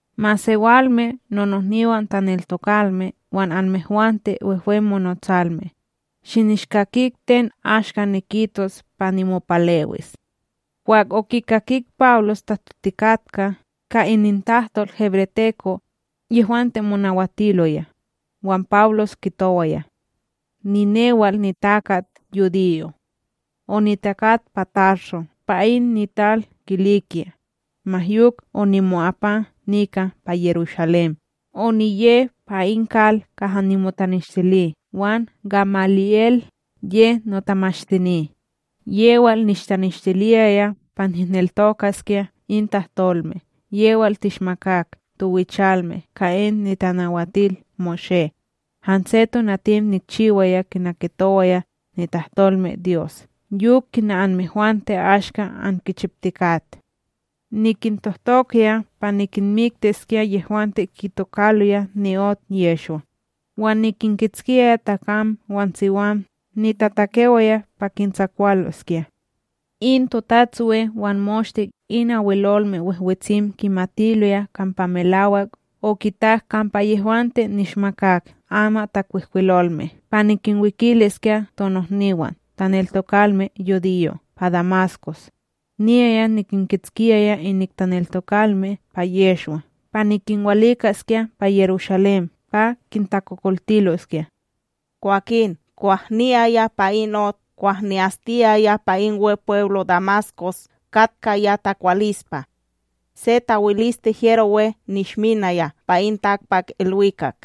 —Masewalme nonohniwan taneltokalme wan anmehwante wehwe monotsalme, shinishkakik ten ashka nikitos pa nimopalewis. Kwah okikakik Pawlos tahtotikatka ka inintahtol hebreteko, yehwante monawatiloya, wan Pawlos kitowaya: —Ninewal nitakat yudiyo. Onitakat pa Tarso pa in nital Kilikya, ma yok onimo'apa nika pa Yerushalém oniye pa in kal kaha nimotaneshtili wan Gamali'El ye notamashtini, yewal nishtanishtiliyaya pa nihneltokaskya in tahtolme yewal tishmakak towichalme ka in NitanawatilMoshé. Hanse tonatim nikchiwaya kina kitowaya nitahtolmeDyos yok kina anmehwante ashka ankichiptikat. Nikintohtokaya pa nikinmiktiskya yehwante kitokaloya ni'ot Yehshwa, wan nikinkitskiyaya takam wan siwam nitatakewaya pa kintsakwaloskya. In TotatsWe wan moshte in Abwelolme Wehwetsim kimatiloya kampa melawak okitak kampa yehwante nishmakak amatTakwihkwilolme pa nikinwikiliskya tonohniwan taneltokalme yudiyo' pa Damaskos, niyaya nikinkitskiyaya inik taneltokalme pa Yehshwa pa nikinwalikaskya pa Yerushalém pa kintakokoltiloskya. ’Kwakin kwah niyaya pa in ot, kwah ni'astiyaya pa in Wepweblo Damaskos, katkaya takwalispa, se tawiliste hyero we nishminaya pa in takpakIlwikak,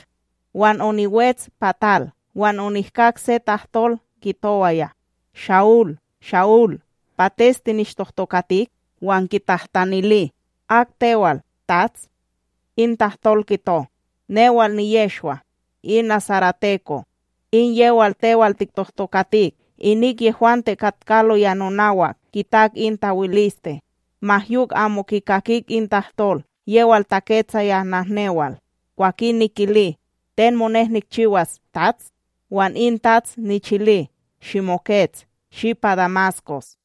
wan oniwets pa tal, Wan onihkak se tahtol kitowaya: “Sha'ul, Sha'ul, pates tinishtohtokatik?” Wan niktahtanili: “Ak tewal, TATS?” In tahtol kito: “Newal niYehshwa in nasareteko, in yewal tewal tiktohtokatik.” Inik yehwante katkaloya nonawak kitak in tawiliste, ma yok amo kikakik in tahtol yewal taketsaya nahnewal. Kwakin nikili: “Ten monek nikchiwas, TATS?” Wan in TATS nichili: “Shimokets, shi pa Damaskos,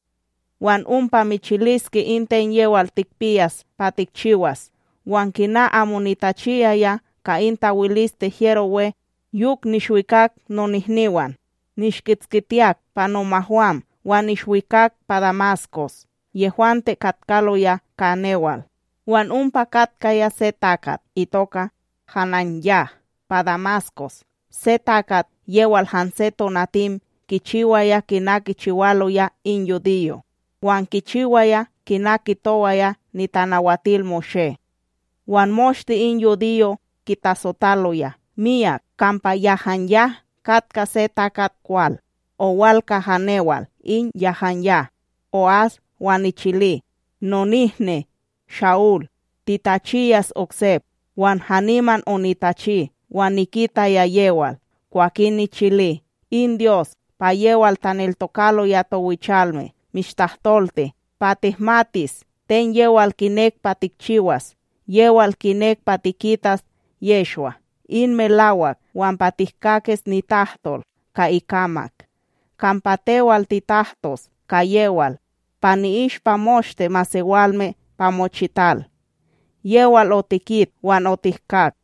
wan ompa michiliske in ten yewal tikpiyas pa tikchiyas.” Wan kina amo nitachiyaya ka in tawiliste hyero we, yok nishwikak nonihniwam nishkitskitiyak pa nomahwam wan nishwikak pa Damaskos yehwante katkaloya ka newal. ’Wan ompa katkaya se takat itoka HananYah pa Damaskos, se takat yewal hanse tonatim kichiwaya kina kichiwaloya in yudiyo' wan kichiwaya kina kitowaya NitanawatilMoshé, wan moshte in yudiyo' kitasotaloya miyak kampa HananYah katka se takat kwal. Owal kaha newal in HananYah, o'as wan nichili: “Nonihni Sha'ul, titachiyas oksep.” Wan haniman onitachi wan nikitaya yewal. Kwakin nichili: “In Dyos pa yewal taneltokaloya towichalme mishtahtolti pa tihmatis ten yewal kinek pa tikchiwas, yewal kinek pa tikitas Yehshwa in melawak wan pa tihkakis nitahtol ka ikamak. Kampa tewal titahtos ka yewal pa ni'ishpa moshte masewalme pa mochital, yewal otikit wan otihkak.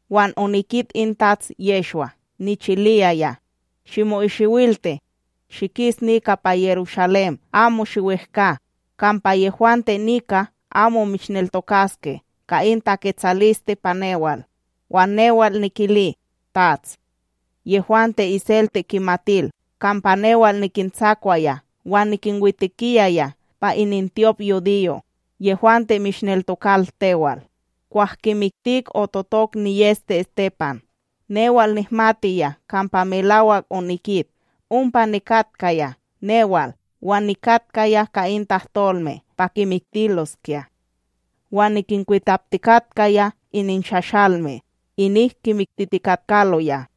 Wan onikit in Tats Yehshwa, nichiliyaya: “Shimo'isiwilti, shikis nika pa Yerushalém amo shiwehkA, kampa yehwante nika amo mishneltokaske ka in taketsaliste pa newal.” Wan newal nikili: “TATS, yehwante iselte kimatil kampa newal nikintsakwaya wan nikinwitekiyaya pa inintyopYudiyo' yehwante mishneltokal tewal, kwah kimiktik ototok niyEste Estepan, newal nihmatiya kampa melawak onikit, ompa nikatkaya newal wan nikatkaya ka in tahtolme pa kimiktiloskya, wan nikinkwitaptikatkaya ininshashalme inik kimiktitikatkaloya.”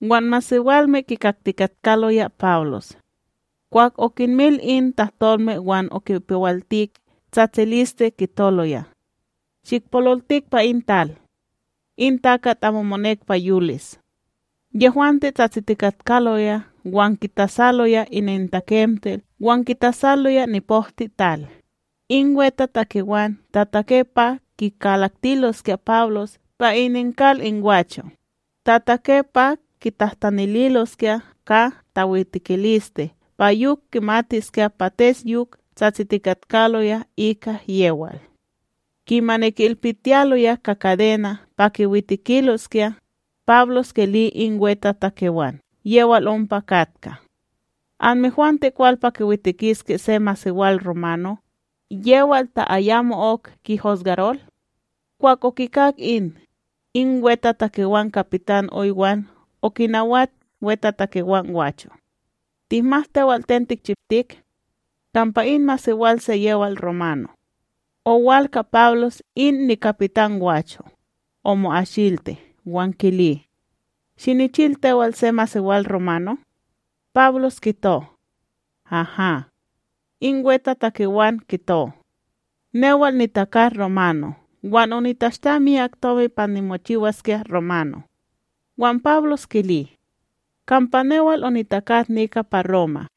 Wan masewalme kikaktikatkaloya Pawlos; kwah okinmil in tahtolme wan okipewaltik tsatsiliste kitoloya: —Shikpololtik pa in tal! In takat amo monek pa yolis! Yehwante tsatsitikatkaloya wan kitasaloya inintakemtil wan kitasaloya nipokteTal, in wetatakewan tatake pa kikalaktiloskya Pawlos pa ininkal in gwacho', tatake pa kitahtanililoskya ka tawitekiliste pa yok kimatiskya pates yok tsatsitikatkaloya ika yewal. Kimani ki'ilpitiyaloya ka kadena' pa kiwitekiloskya, Pawlos kili in wetatakewan yewal ompa katka: —Anmehwante kwal pa kiwitekiske se masewal romano, yewal ta ayamo'ok kihusgarol? Kwah okikak in, in wetatakewan kapitan oy wan okinawat wetatakewan gwacho: —Tihmat tewal ten tikchiptik, kampa in masewal se yewal romano. Owal ka Pawlos in nikapitan gwacho, omo'asilti wan kili: —Shinichil tewal se masewal romano? Pawlos kito: —Haha. In wetatakewan kito: —Newal nitakat romano wan onitashta miyak tomi pa nimochiwaskya romano. Wan Pawlos kili: —Kampa newal onitakat nika pa Roma.